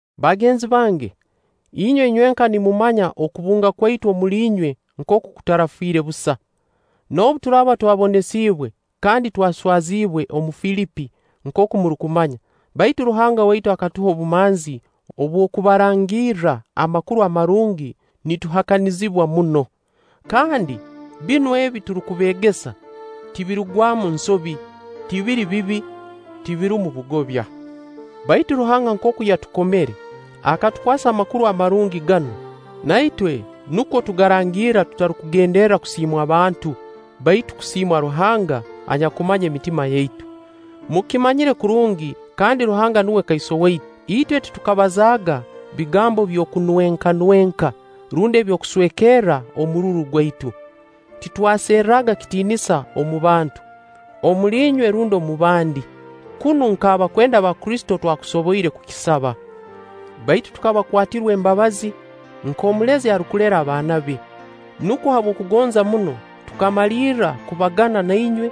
Bagenzi bange, inywe inywenka nimumanya okubunga kwaitu omuli inywe nkooku kutarafiire busa. Noobu turaaba twabonesiibwe kandi twaswaziibwe omu Filipi nkooku murukumanya; baitu Ruhanga waitu akatuha obumanzi obw'okubarangirra Amakuru Amarungi nituhakanizibwa muno. Kandi binu ebi turukubeegesa tibirugwamu nsobi, tibiri bibi, tibirumu bugobya. Baitu Ruhanga nkooku yakukomere, akatukwasa Amakuru Amarungi ganu, na itwe nukwo tugarangirra tutarukugenderra kusiimwa abantu, baitu kusiimwa Ruhanga anyakumanya emitima yaitu. Mukimanyire kurungi, kandi Ruhanga nuwe kaiso waitu, itwe titukabazaaga bigambo by'okunwekanweka, rundi eby'okuswekerra omururu gwaitu. Titwaserraga kitiinisa omu bantu: omuli inywe rundi omu bandi, kunu nk'abakwenda ba Kristo twakusoboire kukisaba. Baitu tukabakwatirwa embabazi, nk'omulezi arukulera abaana be. Nukwo habw'okubagonza muno, tukamalirra kubagana na inywe,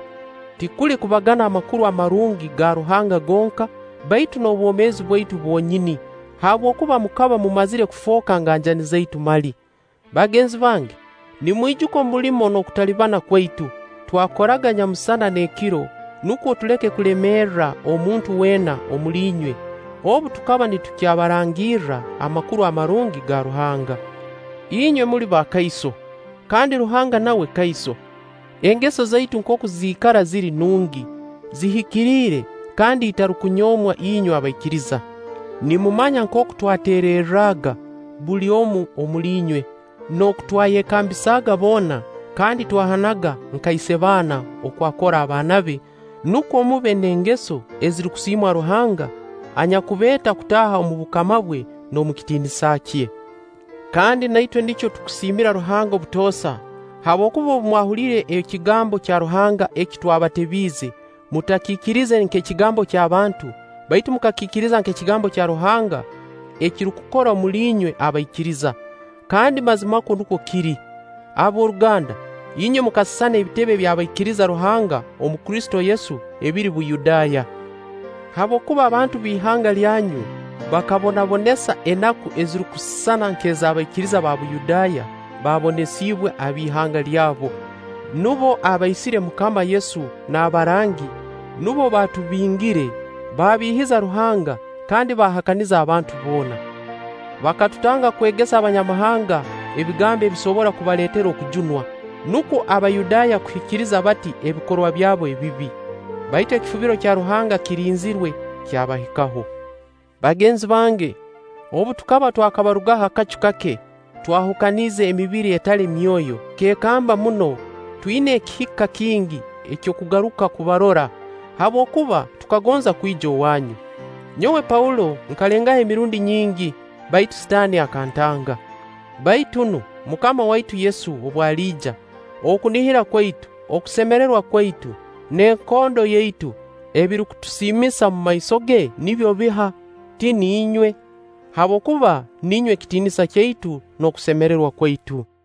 tikuli kubagana Amakuru Amarungi ga Ruhanga gonka, baitu n'obwomeezi bwaitu bwonyini, habwokuba mukaba mumazire kufooka nganjani zaitu mali. Bagenzi bange, nimwijuka omulimo n'okutalibana kwaitu; twakoraga nyamusana n'ekiro nukwo tuleke kulemerra omuntu weena omuli inywe, obu tukaba nitukyabarangirra Amakuru Amarungi ga Ruhanga. Inywe muli bakaiso, kandi Ruhanga nawe kaiso, engeso zaitu nkooku ziikara ziri nungi, zihikiriire kandi itarukunyoomwa inywe abaikiriza. Nimumanya nkooku twateererraga buli omu omuli inywe, n'oku twayekambisaaga boona kandi twahanaga nka isebaana oku akora abaana be, nukwo mube n'engeso ezirukusiimwa Ruhanga, anyakubeeta kutaaha omu bukama bwe n'omu kitiinisa kye. Kandi na itwe nikyo tusiimira Ruhanga obutoosa, habwokuba obu mwahuliire ekigambo kya Ruhanga eki twabatebiize, mutakiikirize nk'ekigambo ky'abantu, baitu mukakiikiriza nk'ekigambo kya Ruhanga ekirukukora omuli inywe abaikiriza. Kandi mazimakwo nukwo kiri. Ab'oruganda, inywe mukasisana ebitebe by'abaikiriza Ruhanga omu Kristo Yesu ebiri Buyudaaya; habwokuba abantu ab'ihanga lyanyu bakababonesa enaku ezirukusisana nk'ez'abaikiriza ba Buyudaaya baabonesiibwe ab'ihanga lyabo. Nubo abaisire MUKAMA Yesu n'abarangi, nubo baatubingire, baabiihiza Ruhanga kandi baahakaniza abantu boona. Bakatutanga kwegesa Abanyamahanga ebigambo ebisobora kubaleetera okujunwa, nukwo Abayudaaya kuhikiriza bati ebikorwa byabo ebibi. Baitu ekifubiro kya Ruhanga kirinzirwe kyabahikaho. Bagenzi bange, obu tukaba twakabarugaho akacu kake twahukaniize emibiri etali myoyo, tukeekamba muno, twina ekihika kingi eky'okugaruka kubarora; habwokuba tukagonza kwija owaanyu. Nyowe Paulo nkalengaho emirundi nyingi, baitu Sitaani akantanga. Baitu nu, MUKAMA waitu Yesu obu aliija, okunihira kwaitu, okusemererwa kwaitu, n'ekondo yaitu ebirukutusiimisa omumaiso ge nibyo biha? Ti niinywe? Habwokuba niinywe kitiinisa kyaitu n'okusemererwa kwaitu.